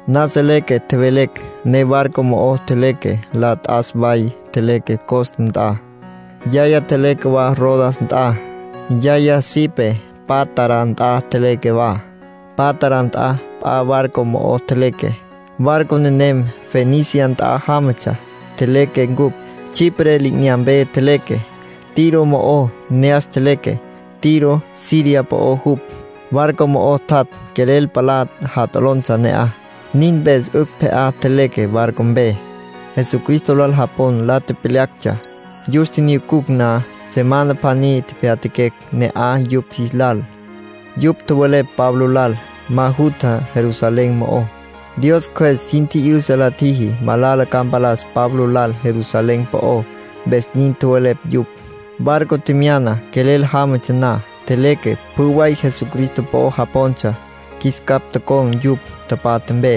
Nasa leque tjevelecj, ne barco mo'o tjeleque. La t'as way tjeleque Cos nt'a. Yaya tjeleque wa Rodas nt'a. Yaya sipé Pátara nt'a tjeleque wa. Pátara nt'a p'a barco mo'o tjeleque. Barco nenem Fenicia nt'a jámatsja. Tjeleque ncupj. Chipre li'inyampe tjeleque. Tiro mo'o ne'as tjeleque. Tiro Siria po'ó jupj. Barco mo'o tjat' quelel palá jat'olontsja ne'aj. Nin mpes 'ücj pje'á tjeleque barco mpe. Jesucristo lal japon la tepyalactsja. Yus tjinyucucj na, semana pjaní tepyatjaquecj ne'aj yupj jis lal. Yupj tjowelepj Pablo lal: “Ma jutja Jerusalén mo'ó”. Dios Cjües sin tji'yüsa la tjiji malala ca mpalas Pablo lal Jerusalén po'ó, mpes nin tjowelepj yupj. Barco tjemyana quelel jámatsja na, tjeleque. Pjü way Jesucristo po'o japontsja, qjuis capj tocon̈ yupj tapatja mpe.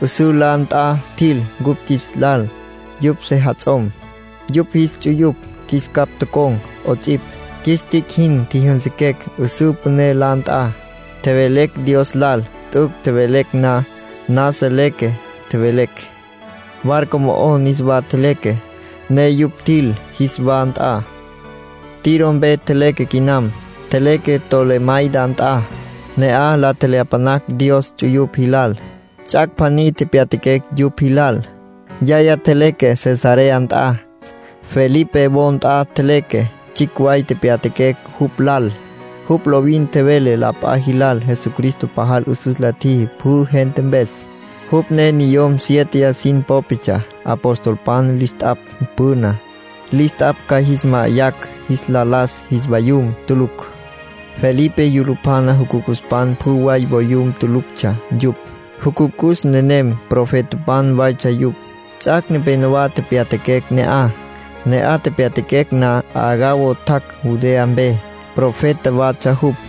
'Üsǘ la nt'a tjil cupj qjuis lal. Yupj sejats'om, yupj jis ts'uyupj qjuis capj tocon̈ 'ots'ipj. Qjuis tic' jin tjijyünsüquecj 'üsǘ püné la nt'a, tjevelecj Dios lal. T'üc' tjevelecj na, nasa leque tjevelecj. Barco mo'o niswa tjeleque, ne yupj tjil jis wa nt'a. Tiro mpe tjeleque quinam. Tjeleque Tolemaida nt'a. Ne'aj la tjelyapanacj Dios ts'uyupj jilal. Ts'ac' pjaní tepyatjaquecj yupj jilal. Yaya tjeleque Cesarea nt'a. Felipe wo nt'a tjeleque, tsjicj way tepyatjaquecj jupj lal. Jupj lovin tjevele la p'a jilal Jesucristo pajal 'üsüs la tjiji pjü gente mpes. Jupj ne niyom siéteya sin popetsja apostolpan lis t'apj püná. Lis t'apj ca jis ma'ayacj jis la las jis vayum tulucj. Felipe yulupjana jucucuspan pjü way voyum tuluctsja yupj. Jucucus nenem profetapan waytsja yupj. Ts'ac' nepenowá tepyatjaquecj ne'aj. Ne'aj tepyatjaquecj na Agabo tjac' Judea mpe. Profeta watsja jupj.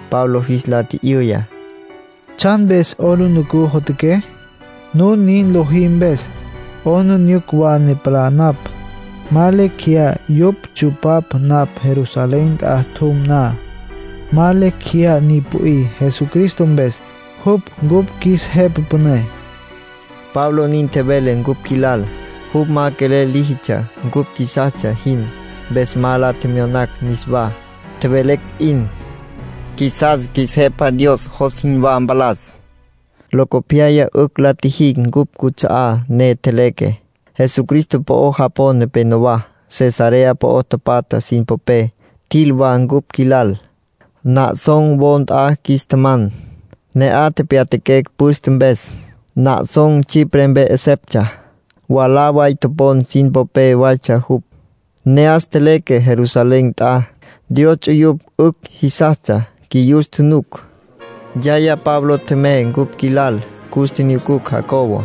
Pablo jis la tji'yüya: —¿Tsjan mpes 'aplijila jotjaqué? Nun nin lojí mpes 'aplijila wa ne palá napj. Ma lecj jeyá yupj ntsu'pacj napj Jerusalén nt'a tjum na. Ma lecj jeyá ni pü'í Jesucristo mpes, jupj cupj qjuis Jepa Püné —Pablo nin tjevele cupj qjuilal. Jupj ma quelel líjitsja cupj qjuisastsja jin, mpes ma la tjemyonacj niswá. Tjevelecj p'in: —Qjuisas qjuis Jepa Dios jos jinwá mpalas. Locopyaya 'ücj la tjijicj cupj cuts'a'á ne tjeleque. Jesucristo po'o japon nepenowá, Cesarea po'o tapatja sin popé, tjil wa cupj qjuilal. Mnosán wo nt'a qjuis tjaman, ne'aj tepyatjaquecj püste mpes. Mnosán Chipre mpe 'eseptsja. Mwalá way topon sin popé waytsja jupj. Ne'as tjeleque Jerusalén nt'a. Dios ts'uyupj 'ücj jisastsja qjuiyus tjunuc. Yaya Pablo tjemey cupj qjuilal, cus tjinyucucj Jacobo.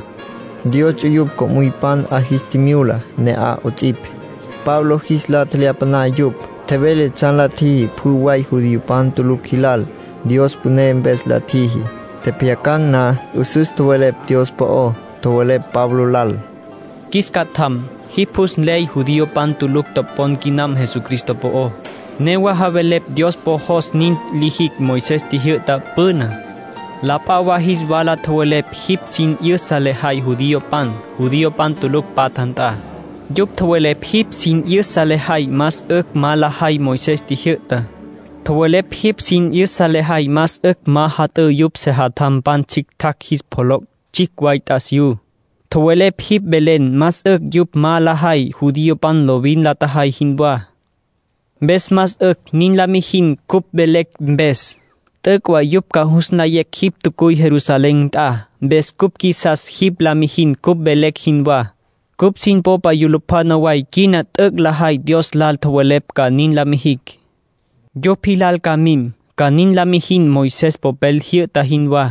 Dios ts'uyupj co'müypan 'a jis tjimyula ne'aj 'ots'ipj. Pablo jis la tjelyapaná yupj. Tjevele tsjan la tjiji pjü way judiopan tulucj jilal. Dios püné mpes la tjiji. Tjepjyacan̈ na, 'üsüs tjowelepj Dios po'ó. Tjowelepj Pablo lal: “Qjuis catjam, jipj jus nley judiopan pülücj topon quinam Jesucristo po'ó. Newa javelepj Dios po jos nin lijicj Moisés tjijyü'ta püná. La p'a wa jis wala tjowelepj jipj sin 'yüsa lejay judiopan, judiopan tulucj patja nt'a. Yupj tjowelepj jipj sin 'yüsa lejay más 'ücj ma lajay Moisés tjijyü'tá. Tjowelepj jipj sin 'yüsa lejay más 'ücj ma jat'ǘ yupj sejatjampan tsjictjacj jis pjoloc' tsjicj way t'asiyú. Tjowelepj jipj velen más 'ücj yupj ma lajay judiopan lovin la tjajay jinwá. Mpes más 'ücj nin la mijin cupj velecj mpes. T'üc' way yupj ca jus nlayecj jipj tjacuy Jerusalén nt'a. Mpes cupj qjuisas jipj la mijin cupj velecj jinwá. Cupj sin popa yulupjana way quina t'üc' lajay Dios lal tjowelepj ca nin la mijicj. Yupj jilal ca mim, ca nin la mijin Moisés popel jyü'ta jinwá,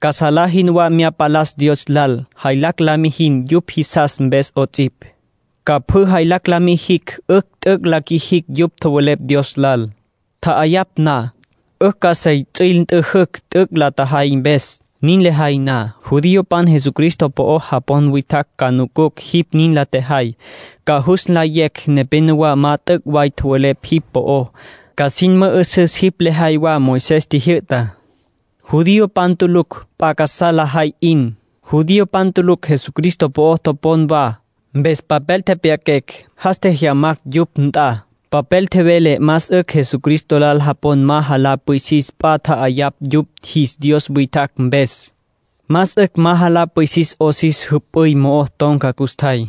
ca salá jinwá mya palas Dios lal. Jaylacj la mijin yupj jisas mpes 'ots'ipj, ca pjü jaylacj la mijicj 'ücj t'üc' la qjuijicj yupj tjowelepj Dios lal. Tja'ayapj na, 'ücj ca sey ts'üil nt'üjücj t'üc' la tjajay mpes. Nin lejay na, judiopan Jesucristo po'o japon witjacj ca nucucj jipj nin la tjejay. Ca jus nlayecj nepénowa ma t'üc' way tjowelepj jipj po'ó. Ca sin mü'üsüs jipj lejay wa Moisés tjijyü'tá. ”Judiopan tulucj p'a casá lajay 'in. Judiopan tulucj Jesucristo po'o topon wa, mpes papel tepyaquecj, jas tjejyamacj yupj nt'a. Papel tjevele más 'ücj Jesucristo lal japon ma jalá pwisis p'a tja'ayapj yupj jis dios witjacj mpes. Más 'ücj ma jalá pwisis 'os jüp'üy mo'o ton̈ca custjay.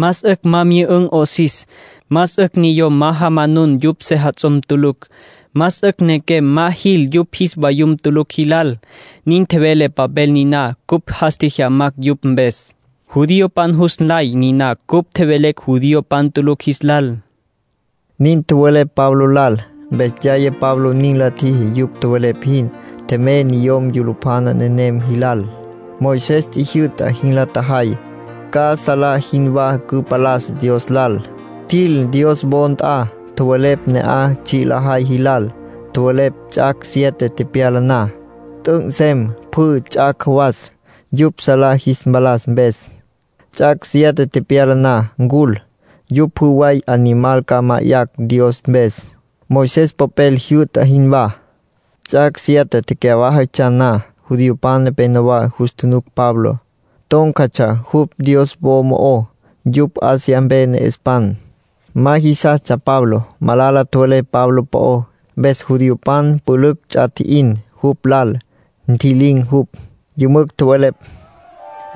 Más 'ücj ma myü'ün̈ 'osis. Más 'ücj niyom ma jamanun yupj sejats'om tulucj. Más 'ücj nequem ma jil yupj jis vayum tulucj jilal. Nin tjevele papel niná cupj jas tjejyamacj yupj mpes. Judiopan jus nlay niná cupj tjevelecj judiopan tulucj jis lal”, nin tjowelepj Pablo lal. Mpes yaya Pablo nin la tjiji yupj tjowelepj jin. Tjemey niyom yulupjana nenem jilal. Moisés tjijyü'ta jin la tjajay, ca salá jinwá cüpalas Dios lal. Tjil Dios wo nt'a, tjowelepj ne'aj tsji' lajay jilal. Tjowelepj ts'ac' siete tepyala na, t'üc' nsem pjü ts'ac' jawas yupj salá jis mpalas mpes. Ts'ac' siete tepyala na ncul, yupj pjü way animal ca ma'ayacj Dios mpes, Moisés popel jyü'ta jinwá. Ts'ac' siete cyawájatsja na, judiopan nepenowá jus tjunuc Pablo, tón̈catsja jupj Dios wo mo'ó. Yupj Asia mpe ne'espan. Ma jisastsja Pablo. Malala tjowelepj Pablo po'ó, mpes judiopan pülücj ts'a tji'in jupj lal. Ntji'lin̈ jupj. Yümücj tjowelepj: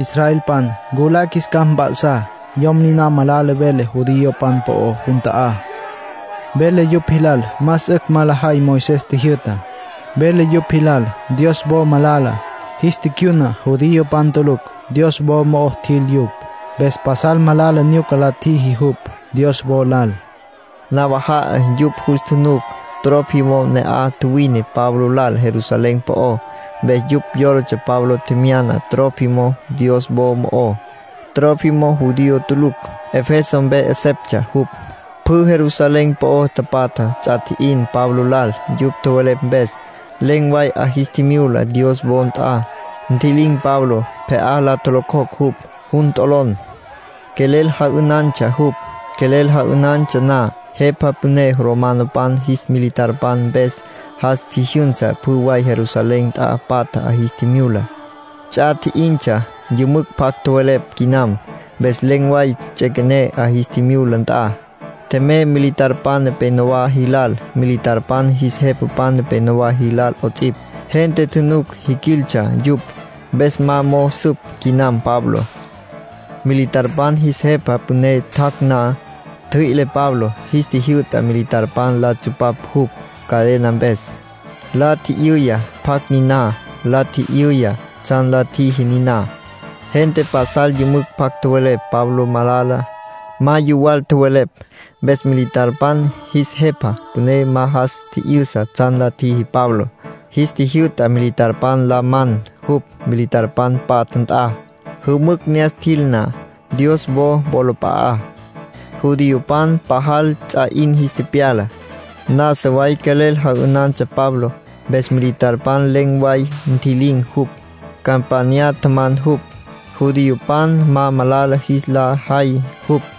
“Israelpan, nculá qjuis capj mp'a'sá. Yom niná malala vele judiopan po'ó jun ta'á. Vele yupj jilal más 'ücj ma lajay Moisés tjijyü'tá. Vele yupj jilal Dios wo malala. Jis ticyuna judiopan tulucj. Dios wo mo'ó tjil yupj. Mpes pasal malala nyuca la tjiji jupj Dios wo lal”, nin tjowelepj. Nawaja'a yupj jus tjunuc Trófimo ne'aj tjuwine Pablo lal Jerusalén po'ó. Mpes yupj yólatsja Pablo tjemyana Trófimo Dios wo mo'ó. Trófimo judío tulucj, Efeso mpe 'eseptsja jupj. Pjü Jerusalén po'o tapatja ts'a tji'in Pablo lal yupj tjowelepj mpes. Len̈ way 'a jis tjimyula Dios wo nt'a, ntji'lin̈ Pablo. Pje'á la tjolocjocj jupj. Jun t'olon. Quelel ja'ünantsja jupj. Quelel ja'ünantsja na, jepa püné romanopan jis militarpan mpes jas tji'yüsa pjü way Jerusalén nt'a patja 'a jis tjimyula. Ts'a tji'intsja, yümücj pjac tjowelepj quinam. Mpes len̈ way ts'üequené 'a jis tjimyula nt'a. Tjemey militarpan nepenowá jilal, militarpan jis jepapan nepenowá jilal 'ots'ipj. Gente tjunuc jiquiltsja yupj, mpes ma mo'o süp quinam Pabló. Militarpan jis jepa püné tjac' na, ntjüi'le Pabló. Jis tjijyü'ta militarpan la tsupapj jupj cadena mpes. La tji'yüya pjacj niná. La tji'yüya tsjan la tjíjitsja niná. Gente pasal yümücj pjac tjowelepj Pablo malala. Ma yuwal tjowelepj. Mpes militarpan jis jepa püné ma jas tji'yüsa tsjan la tjiji Pabló. Jis tjijyü'ta militarpan la man jupj militarpan patja nt'a. Jümücj ne'as tjil na, Dios wo wolap'a'á, judiopan pajal ts'a 'in jis tepyala. Nasa way quelel ja'ünantsja Pablo. Mpes militarpan len̈ way ntji'lin̈ jupj, campanya tjaman jupj, judiopan ma malala jis la jay jupj.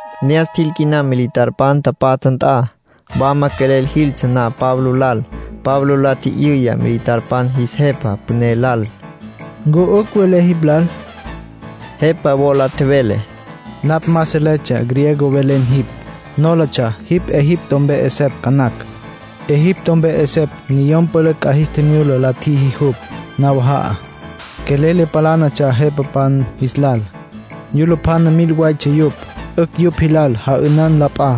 Ne'as tjil quinam militarpan tapatja nt'a. Wama quelel jiltsja na Pablo lal, Pablo la tji'yüya militarpan jis jepa püné lal: —¿Ncu 'ücj velé jipj lal? Jepa wola tjevele: —Napj ma seletsja griego velen jipj. Nólatsja jipj Egipto mpe 'esepj ca nacj. Egipto mpe 'esepj niyom pülücj 'a jis tjimyula la tjiji jupj nawaja'a, quelel le palánatsja jepapan jis lal. Yulupjana mil waytsja yupj. 'Ücj yupj jilal ja'ünan la p'a.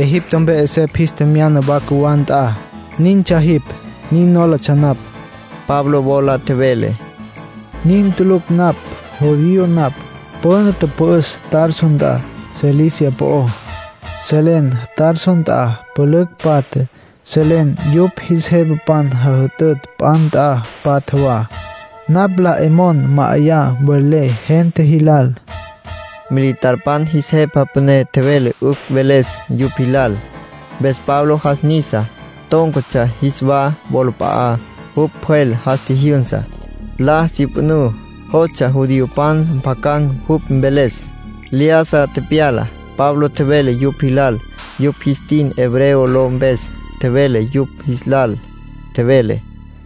Egipto mpe 'esepj jis tjemyana wa cjuwá nt'a. Nintsja jipj, nin nólatsja napj. Pablo wola tjevele: —Nin tulucj napj. Judío napj. Püna tüpü'üs Tarso nt'a Cilicia po'ó. Selen Tarso nt'a pülücj patja, selen yupj jis jepapan jajütütj p'a nt'a patja wa. Napj la 'e mon ma'ayan mvelé gente jis lal —Pablo nin tjevele. Militarpan jis jepa püné tjevele 'ücj mveles yupj jilal. Mpes Pablo jas nisa, tón̈catsja jis wa wolap'a'á. Jupj pjwel jas tjijyünsa, la syüpjünǘ; jostsja judiopan mpjacan̈ jupj mveles. Lyájasa tepyala. Pablo tjevele yupj jilal; yupj jis tin hebreo ló mpes tjevele yupj jis lal. Tjevele: